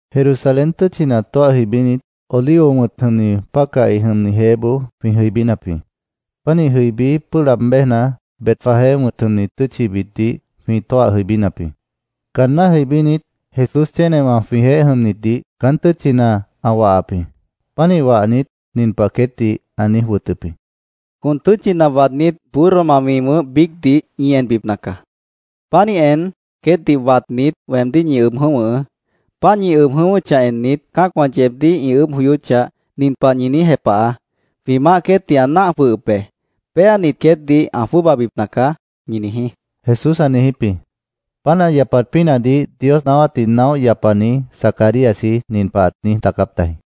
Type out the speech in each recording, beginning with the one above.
Jerusalén tʉ́tchina tóah jʉibínit, Olivo wʉ̃t jʉmni pácahi jʉmni jeéboó jwĩ jʉibínap jĩ. Pánih jʉibí, pʉ́ʉh laab béjna, Betfagé wʉ̃t jʉmni tʉ́tchibitdih jwĩ tóah jʉibínap jĩ. Caanná jʉibínit, Jesús chénewã jwĩjeéh jʉmnitdih caán tʉ́tchina ã wahap jĩ. Pánih wahnit, nin pah queétdih ã niíj wʉtʉp jĩ: —Con tʉ́tchina waadnít, burroma mi wʉ̃ʉ́h biícdih ñi enbipna caá. Pánih en, queétdih watnit, weemdíh ñi ʉb jʉ̃óh wʉ̃hʉʉ́. Páant ñi ʉb jʉ̃ʉ́wʉ́chah ennit, cã́acwã yeebdíh ĩ ʉʉ́bh joyóchah, nin pah ñi niíj jepahaá: ‘Jwĩ maáh queétdih ã náah jwʉhʉp be. Péanit, queétdih ã jwʉ́ʉbabipna caá’, ñi niijí, Jesús ã niijíp jĩ. Páant ã yapat pínahdih Dios naáwátdih naóh yapani Zacaríasji nin pah ãt niíj daacáp tajĩ: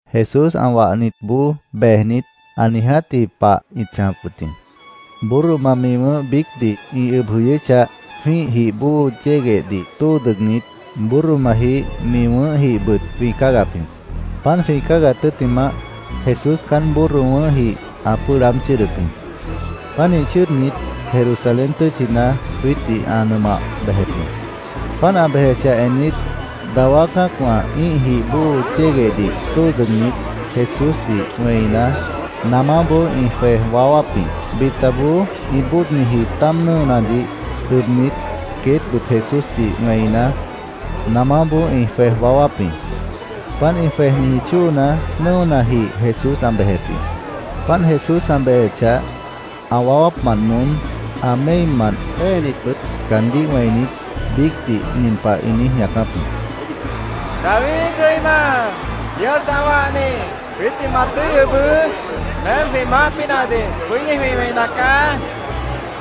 Jesús ã wahnitboó bejnit, ã niijátji pah ĩt chãjap wʉt jĩ. Burroma, mi wʉ̃ʉ́h biícdih ĩ ʉb jʉyʉ́chah, jwĩ́ih jih bóo yéguehdih tóo dʉgnit, burromajih mi wʉ̃ʉ́hjihbʉt jwĩ cáagap jĩ. Páant jwĩ cáagat tʉ́ttimah, Jesús caán burro wʉ̃ʉ́hjih ã pʉ́ʉh laáb chʉ́ʉdʉp jĩ. Pánih chʉ́ʉdnit, Jerusalén tʉ́tchina jwiítdih ã nʉmah bejep jĩ. Páant ã bejechah ennit, dawá cã́acwã ĩ́ih jih bóo yéguehdih tóo dʉgnit, Jesúsdih wẽina, namáboó ĩ jwej waáwáp jĩ. Bitaboó ĩ bóodniji táam nʉ́onadih ʉbnit, queétbʉt Jesúsdih wẽina, namáboó ĩ jwej waáwáp jĩ. Páant ĩ jwejniji chóona, nʉ́onajih Jesús ã bejep jĩ. Páant Jesús ã bejechah, ã waáwápmant moón, ã méimant péenitbʉt caandíh wẽinit, biícdih nin pah ĩ niíj ñaacáp jĩ: —¡David jʉima, Dios ã wahni, jwiítdih ma tʉ́i ʉbʉʉ́! ¡Meém jwĩ maáh pínahdih bʉ́dí jwĩ wẽina caá! ĩ niíj wẽi ñaacáp jĩ.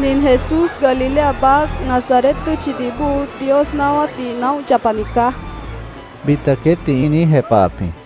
—Nin Jesús, Galilea baác, Nazaret tʉ́tchidih bóo, Dios naáwátdih naóh yapani caá, bita queétdih ĩ niíj jepahap jĩ.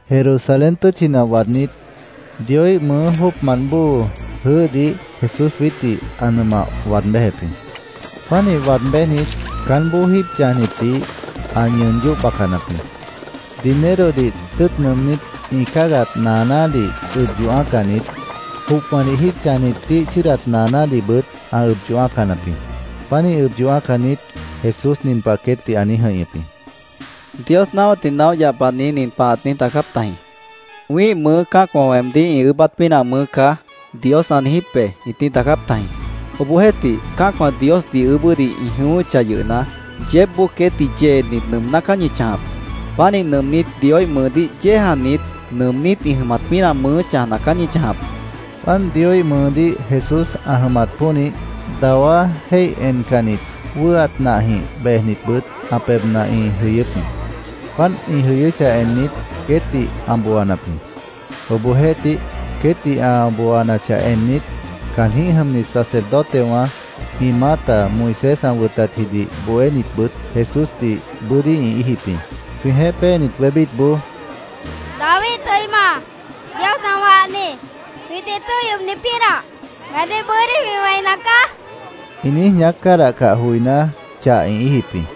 Jerusalén tʉ́tchina waadnít, Dioíh mʉʉ jóocmant bóo jʉʉ́hdih Jesús jwiítdih ã nʉmah waad béjep jĩ. Pánih waad béjnit, caánboó jíib chãjnitdih ã ñʉʉn yóh bacanap jĩ. Dinerodih tʉ́ʉt nʉʉmnít ĩ cáagat naanádih ʉb yoh ã́acanit, jopwãdih jíib chãjnitíh chʉ́ʉdat naanádihbʉt ã ʉb yoh ã́acanap jĩ. Pánih ʉb yoh ã́acanit, Jesús nin pah queétdih ã niíj jʉ̃ihñʉp jĩ: —Dios naáwátdih naóh yapani nin pah ãt niíj daacáp tajĩ: ‘ “Wĩ́ih mʉʉ́ cã́acwã weemdíh ĩ ʉʉ́bát pínah mʉʉ́ caá”, Dios ã niijíp be’, ĩt niíj daacáp tajĩ.Obohjeéhtih, cã́acwã Diosdih ʉʉ́bʉ́dih ĩ jʉyʉ́chah yʉhna, yeébboó queétdih yeenit, nʉʉmná caá ñi chãjap. Pánih nʉʉmnít, Dioíh mʉʉdíh yéejanit, nʉʉmnít ĩ jʉmat pínah mʉʉ́ chãjna caá ñi chãjap, ã niijíp jĩ. Páant Dioíh mʉʉdíh Jesús ã jʉmat pónih, dawá jéih encannit, wʉ́ʉat nahjĩh bejnitbʉt ã pebhna ĩ jʉyʉ́p jĩ. Páant ĩ jʉyʉ́chah ennit, queétdih ã booanap jĩ. Obohjeéhtih, queétdih ã booanachah ennit, caanjĩ́h jʉmnit sacerdotewã ĩ maáta, Moisés ã wʉtatjidih bohénitbʉt Jesúsdih bʉ́dí ĩ íijip jĩ. Jwĩjeéh péenit wébítboó “¡David jʉima, Dios ã wahni, jwiítdih tʉ́i ʉbni pínah, meemdíh bʉ́dí jwĩ wẽina caá!” ĩ niíj ñaác cádahcah joiná, chah ĩ íijip jĩ.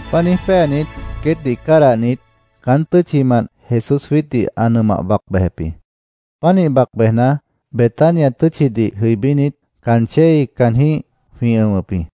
Páant niíj péanit, queétdih cádahnit, caán tʉ́tchimant Jesús jwiítdih ã nʉmah bac bejep jĩ. Pánih bac bejna, Betania tʉ́tchidih jʉibínit, caan chéi caanjĩ́h jwĩ ʉ̃wʉp jĩ.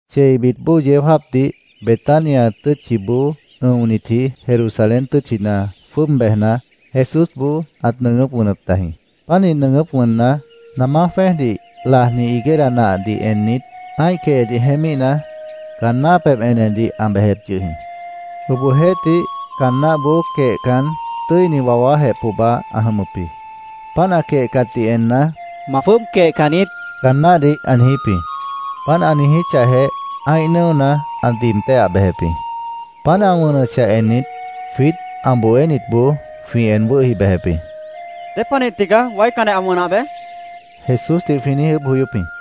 Cheibit bóo yeó jáapdih, Betania tʉ́tchiboó ʉ̃onitji Jerusalén tʉ́tchina jwʉ́ʉb bejna, Jesúsboó ãt nʉʉgʉ́p wʉnʉp tajĩ. Pánih nʉʉgʉ́p wʉnna, namá jwẽ́ejdih lajni higuera nahdih ennit, ã́ih quehedih jeémíhna, caan náh pebh enedih ã bejep yʉh jĩ. Obohjeéhtih, caan náhboó quehcan, tʉ́ini wawájeh pohba ã jʉmʉp jĩ. Páant ã quehcatdih enna, —¡Ma jwʉ́ʉb quehcan niít! caan náhdih ã niijíp jĩ. Páant ã niijíchahjeh, ã́ih nʉ́ona ã diib téhah bejep jĩ. Páant ã wʉnʉchah ennit, jwiít ã bohénitboó jwĩ en wʉ́hi bejep jĩ. —¿Dépanih tigaá waícanjeh ã wʉnah bej? Jesúsdih jwĩ niíj ʉʉ́bh joyóp jĩ.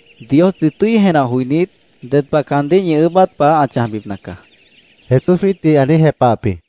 Diosdih tʉ́i jenah joinít, ded pah caandíh ñi ʉʉ́bát pah ã chãjbipna caá, Jesús jwiítdih ã niíj jepahap jĩ.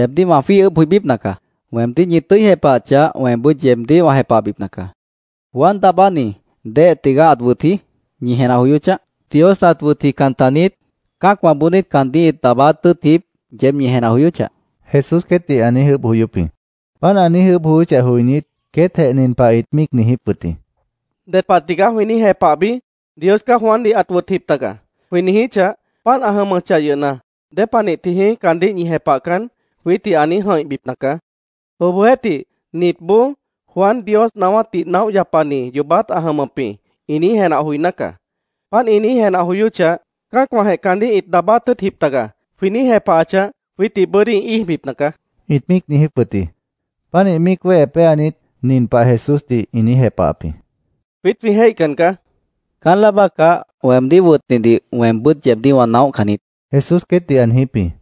—Yeebdíh wã jwíih ʉʉ́bh joibípna caá. Weemdíh ñi tʉ́i jepahachah, weembʉ́t yeebdíh wã jepahbipna caá. Juan Daabánidih ¿déhe tigaá ãt wʉtji? ñi jenah joyóchah. ¿Dios ãt wʉtjican taniít? ¿Cã́acwãboó niít caandíh ĩt daabáát tʉ́ʉtjip? yeéb ñi jenah joyóchah, Jesús queétdih ã niíj ʉʉ́bh joyóp jĩ. Páant ã niíj ʉʉ́bh joyóchah joinít, queétjeh nin pah ĩt míic niijíp wʉt jĩ: “¿Ded pah tigaá jwĩ niíj jepahbi? ‘Dios caá Juandih ãt wʉtjip taga’, jwĩ niijíchah, ‘Páant ã jʉmʉchah yʉhna, ¿dépanih tijĩí caandíh ñi jepahcan?’ jwiítdih ã niíj jʉ̃ihbipna caá. Obohjeéhtih, nitboó ‘Juan Dios naáwátdih naóh yapani yoobát ã jʉmʉp jĩ’, ĩ niíj jenah joiná caá. Páant ĩ niíj jenah joyóchah, ‘Cã́acwãjeh caandíh ĩt daabáát tʉ́ʉtjip taga’, jwĩ niíj jepahachah, jwiítdih bʉ́dí ĩ íijbipna caá”, ĩt míic niijíp wʉt jĩ. Pánih míic wéhe péanit, nin pah Jesúsdih ĩ niíj jepahap jĩ: —Jwiít jwĩ jéihcan caá, ĩ niijíp jĩ. —Caán láa bácah weemdíh wʉtnidih weembʉ́t yeebdíh wã naóhcan niít, Jesús queétdih ã niijíp jĩ.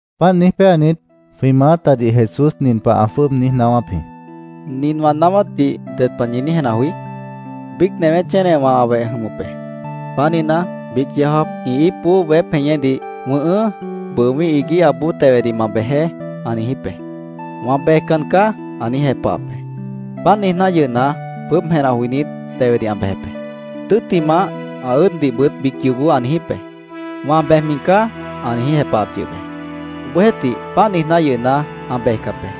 Páant niíj péanit, jwĩ maátadih Jesús nin pah ã jwʉ́ʉb niíj naáwáp jĩ: —Nin wã naáwátdih ¿ded pah ñi niíj jenah joí? Biíc newé chénewã ã weh ĩ jʉmʉp be. Pánihna, biíc yeó jáap ĩ íipboó weép jeñédih, ‘Wʉ̃ʉhʉ́, bʉʉ wĩ́ih iguíhaboó tewedih ma bejeé’, ã niijíp be. ‘Wã bejcan caá’, ã niíj jepahap be. Páant niijná yʉhna, jwʉ́ʉb jenah joinít, tewedih ã bejep be. Tʉ́ttimah, ã ʉ́ʉddihbʉt biíc yoobó ã niijíp be. ‘Wã bejmi caá’, ã niíj jepahap yʉh be. Obohjeéhtih, páant niijná yʉhna, ã bejcap be.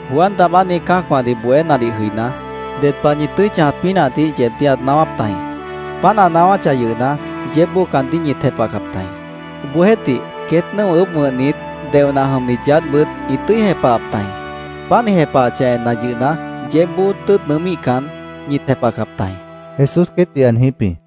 Juan Daabáni cã́acwãdih bohénadih jʉiná, ded pah ñi tʉ́i chãjat pínahdih yeebdíh ãt naáwáp tajĩ. Páant ã naáwáchah yʉhna, yeébboó caandíh ñit jepahcap tajĩ. Obohjeéhtih, queét nʉ́o ʉʉ́bh wʉ̃hnit, deoh nah jʉmnit yaádhbʉt ĩt tʉ́i jepahap tajĩ. Páant ĩ jepahachah enna yʉhna, yeébboó tʉ́ʉt nʉʉ́míhcan, ñit jepahcap tajĩ, Jesús queétdih ã niijíp jĩ.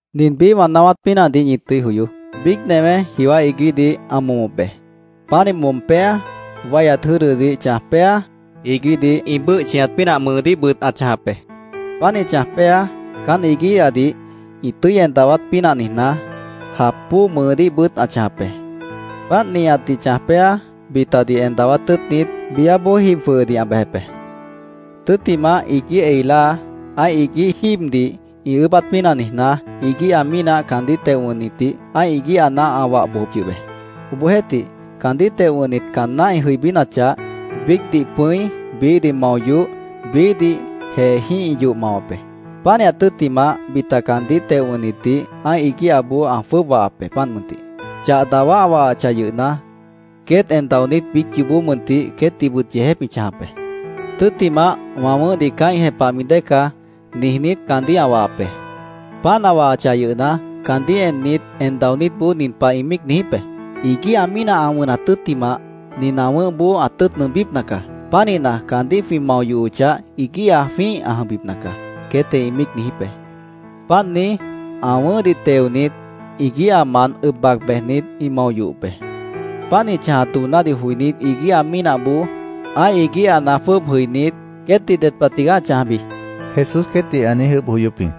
“Nin biíh wã naáwát pínahdih ñi tʉ́i joyoó. Biíc newé jiwá iguíhdih ã momop be. Pánih mom péa, wáihyat jʉ́dʉdih chãj péa, iguíhdih ĩ bʉ́ʉh chʉñat pínah mʉʉdíhbʉt ã chãjap be. Pánih chãj péa, caán iguíhadih ĩ tʉ́i en dawát pínah niijná, jap bóo mʉʉdíhbʉt ã chãjap be. Páant nihatdih chãj péa, bitadih en dawát tʉ́ʉtnit, biáboó jib jwʉhʉdih ã bejep be. Tʉ́ttimah, iguíh ei láa, ã́ih iguíh jíibdih ĩ ʉʉ́bát pínah niijná, iguíha mínah caandíh teo wʉ̃hnitdih ã́ih iguíhana ã wah bojop yʉh be. Obohjeéhtih, caandíh teo wʉ̃hnit caanná ĩ jʉibínachah, biícdih pʉ̃i, biíhdih mao yoh, biíhdih jeejĩ́h ĩ yoh mawap be. Pánihat tʉ́ttimah, bita caandíh teo wʉ̃hnitdih ã́ih iguíhaboó ã jwʉ́ʉb wahap be, páant mʉntih. Chah dawá ã wahachah yʉhna, queét en daonít biíc yoobó mʉntih queétdihbʉt yeejép ĩ chãjap be. “Tʉ́ttimah, ‘Wã wʉ̃ʉ́hdih caá ĩ jepahmi dée caá’, niijnít, caandíh ã wahap be. Páant ã wahachah yʉhna, caandíh ennit, en daonítboó nin pah ĩ míic niijíp be: ‘Iguíha mínah ã wʉnat tʉ́ttimah, nin ã wʉ̃ʉ́hboó ã tʉ́ʉt nʉʉmbípna caá. Pánihna, caandíh jwĩ mao yohochah, iguíha jwĩ́ih ã jʉmbipna caá’, queétjeh ĩ míic niijíp be. Páant niíj, ã wʉ̃ʉ́hdih teonit, iguíhamant ʉb bac bejnit, ĩ mao yohop be. “Páant ĩ chãjat doonádih joinít, iguíha mínahboó ã́ih iguíhana jwʉ́ʉb jʉinít, ¿queétdih ded pah tigaá ã chãjbi?” Jesús queétdih ã niíj ʉʉ́bh joyóp jĩ.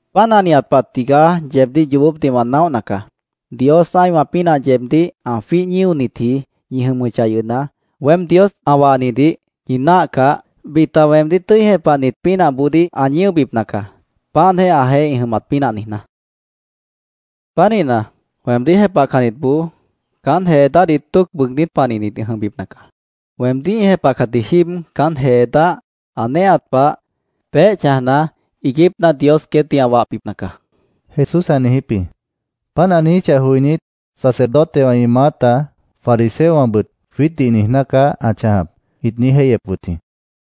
Páant ã nihat pah tigaá yeebdíh yoobópdih wã naóhna caá. Dios ã́ihwã pínah yeebdíh ã jwíih ñíonitji ñi jʉmʉchah yʉhna, weém Dios ã wahnidih ñi náahcah, bita weemdíh tʉ́i jepahnit pínahboodíh ã ñíobipna caá, páantjeh ãjeéh ĩ jʉmat pínah niijná. Pánihna, weemdíh jepahcannitboó caán jee dáhdih tóoc bʉʉgnít panihnit ĩ jʉmbipna caá. Weemdíh ĩ jepahcatji jíib caán jee dáh ã néehat pah, peéh chãjna, iiguípna Dios queétdih ã wahbipna caá, Jesús ã niijíp jĩ. Páant ã niijíchah joinít, sacerdotewã ĩ maáta, fariseowãbʉt “Jwiítdih niijná caá ã chãjap”, ĩt niíj jéihyep wʉt jĩ.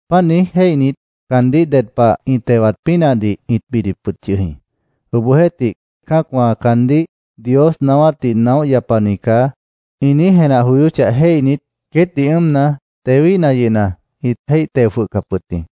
Páant niíj jéihnit, caandíh ded pah ĩ tewat pínahdih ĩt bidip wʉt yʉh jĩ. Obohjeéhtih, cã́acwã caandíh “Dios naáwátdih naóh yapani caá”, ĩ niíj jenah joyóchah jéihnit, queétdih ʉ́ʉmna, tewíhna yʉhna, ĩt jéih teo jwʉhcap wʉt jĩ.